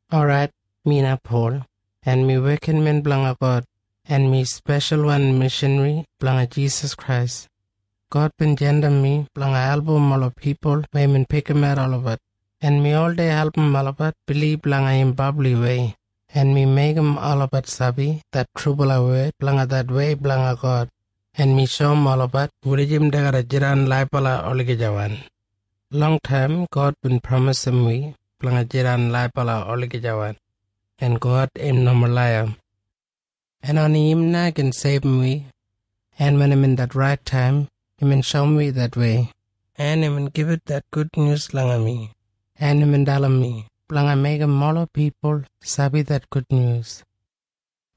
Orait, mi na Pol, en mi wekinmen blanga God, en mi speshalwan mishanri blanga Jisas Krais. God bin jandim mi blanga album ola pipul weya imbin pikimat olabat, en mi oldei album olabat bilib langa im brabliwei, en mi meigim olabat sabi det trubala wed blanga det wei blanga God, en mi shoum olabat wulijim dei garra jidan laibala olagijawan. Longtaim God bin pramisim wi blanga jidan laibala olagijawan. En God im nomo laiya. En oni im na gin seibum wi. En wen imbin det rait taim, imbin shoum wi det wei, en imbin gibit det gudnyus langa mi, en imbin dalim mi blanga meigim ola pipul sabi det gudnyus.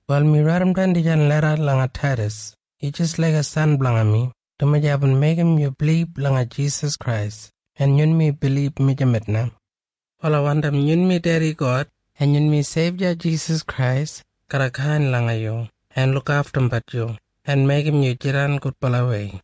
Wal mi raidimdan dijan leda langa yu Taidas. Yu jis laiga san blanga mi, dumaji aibin meigim yu bilib langa Jisas Krais, en yunmi bilib mijamet na. Wal ai wandim yunmi Dedi God en yunmi Seibya Jisas Krais garra kain langa yu en lukaftumbat yu en meigim yu jidan gudbalawei.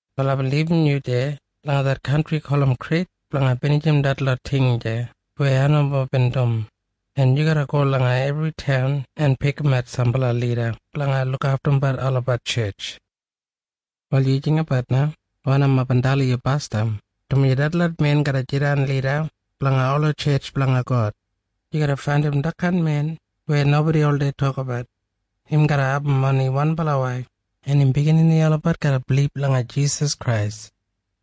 Wal aibin libum yu deya langa det kantri gulum Krit blanga binijim detlot ting deya weya ai nomo bin dum, en yu garra go langa ebri taun en pikimat sambala lida blanga lukaftumbat olabat tjetj. Wal yu jinggabat na wanim aibin dalim yu basdam, dumaji detlot men garra jidan lida blanga ola tjetj blanga God. Yu garra faindim detkain men weya nobodi oldei tokabat. Im garra abum oni wanbala waif, en im biginini olabat garra bilib langa Jisas Krais.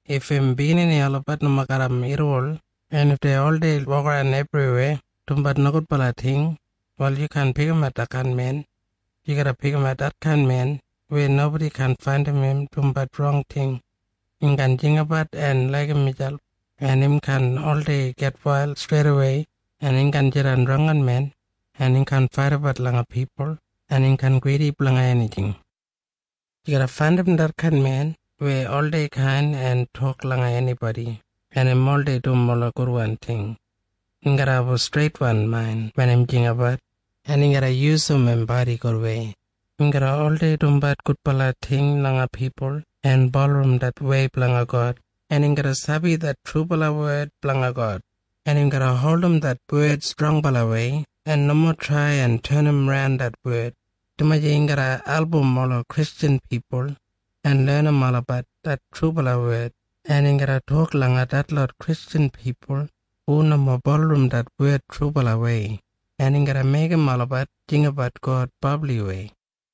If im biginini olabat nomo garram irriwol, en if dei oldei wokaran ebriweya dumbat nogudbala ting, wal yu kaan pikimat detkain men. Yu garra pikimat detkain men weya nobodi kaan faindim im dumbat rong ting. Im kaan jinggabat en laigim miselp, en im kaan oldei gitwail streidawei, en im kaan jidan drangginmen, en im kaan faidabat langa pipul, en im kaan gridi blanga enijing. Yu garra faindim detkain men weya oldei kain en tok langa enibodi, en im oldei dum ola gudwan ting. Im garra abum streitwan main wen im jinggabat, en im garra yusum im bodi gudwei, im garra oldei dumbat gudbala ting langa pipul en bulurrum det wei blanga God, en im garra sabi det trubala wed blanga God, en im garra holdim det wed strongbalawei en nomo trai en tenimran det wed, dumaji im garra album ola Kristjan pipul en lenim olabat det trubala wed, en im garra tok langa detlot Kristjan pipul hu nomo bulurrum det wed trubalawei, en im garra meigim olabat jinggabat God brabliwei.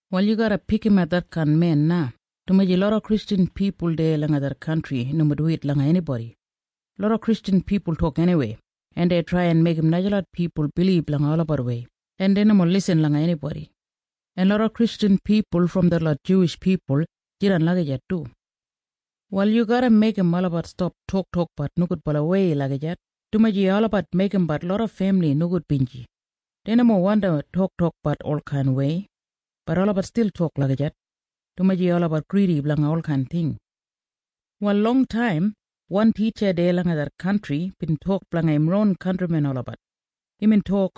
Wal yu garra pikimat detkain men na, dumaji loda Kristjan pipul deya langa det kantri nomo duwit langa enibodi. Loda Kristjan pipul tok eniwei, en dei trai en meigim najalot pipul bilib langa olabat wei, en dei nomo lisin langa enibodi. En loda Kristjan pipul brom detlot Juwish pipul jidan lagijat du. Wal yu garra meigim olabat stap toktokbat nogudbalawei lagijat, dumaji olabat meigimbat loda femili nogudbinji. Dei nomo wandi toktokbat olkainwei. Bat olabat stil tok lagijat, dumaji olabat gridi blanga olkain ting. Wal longtaim wan titja deya langa det kantri bin tok blanga im ron kantrimen olabat. Imbin tok,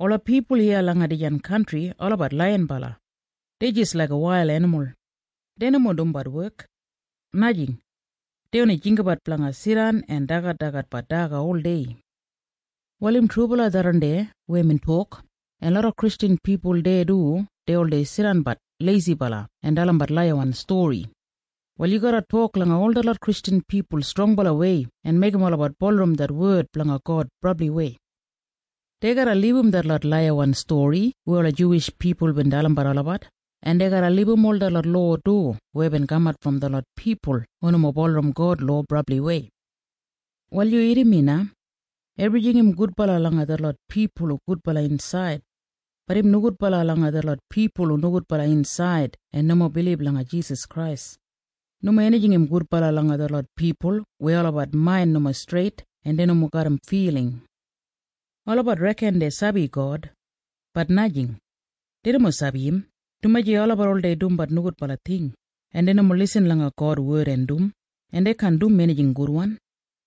“Ola pipul iya langa dijan kantri olabat laiyinbala. Dei jis laiga wail enimul. Dei nomo dumbat wek. Najing. Dei oni jinggabat blanga jidan en dagadagatbat daga oldei.” Wal im trubala tharran deya weya imbin tok, en loda Kristjan pipul deya du dei oldei jidanbat leisibala en dalimbat laiyawan stori. Wal yu garra tok langa ol detlot Kristjan pipul strongbalawei en meigim olabat bulurrum det wed blanga God brabliwei. Dei garra libum detlot laiyawan stori weya ola Juwish pipul bin dalimbat olabat, en dei garra libum ol detlot lowa du weya bin kamat brom detlot pipul hu nomo bulurrum God lowa brabliwei. Wal yu irrim mi na. Ebrijing im gudbala langa detlot pipul hu gudbala insaid. Bat im nogudbala langa detlot pipul hu nogudbala insaid en nomo bilib langa Jisas Krais. Nomo enijing im gudbala langa detlot pipul weya olabat main nomo streit en dei nomo garram filing. Olabat reken dei sabi God. Bat najing. Dei nomo sabi im, dumaji olabat oldei dumbat nogudbala ting, en dei nomo lisin langa God wed en dum, en dei kaan dum enijing gudwan.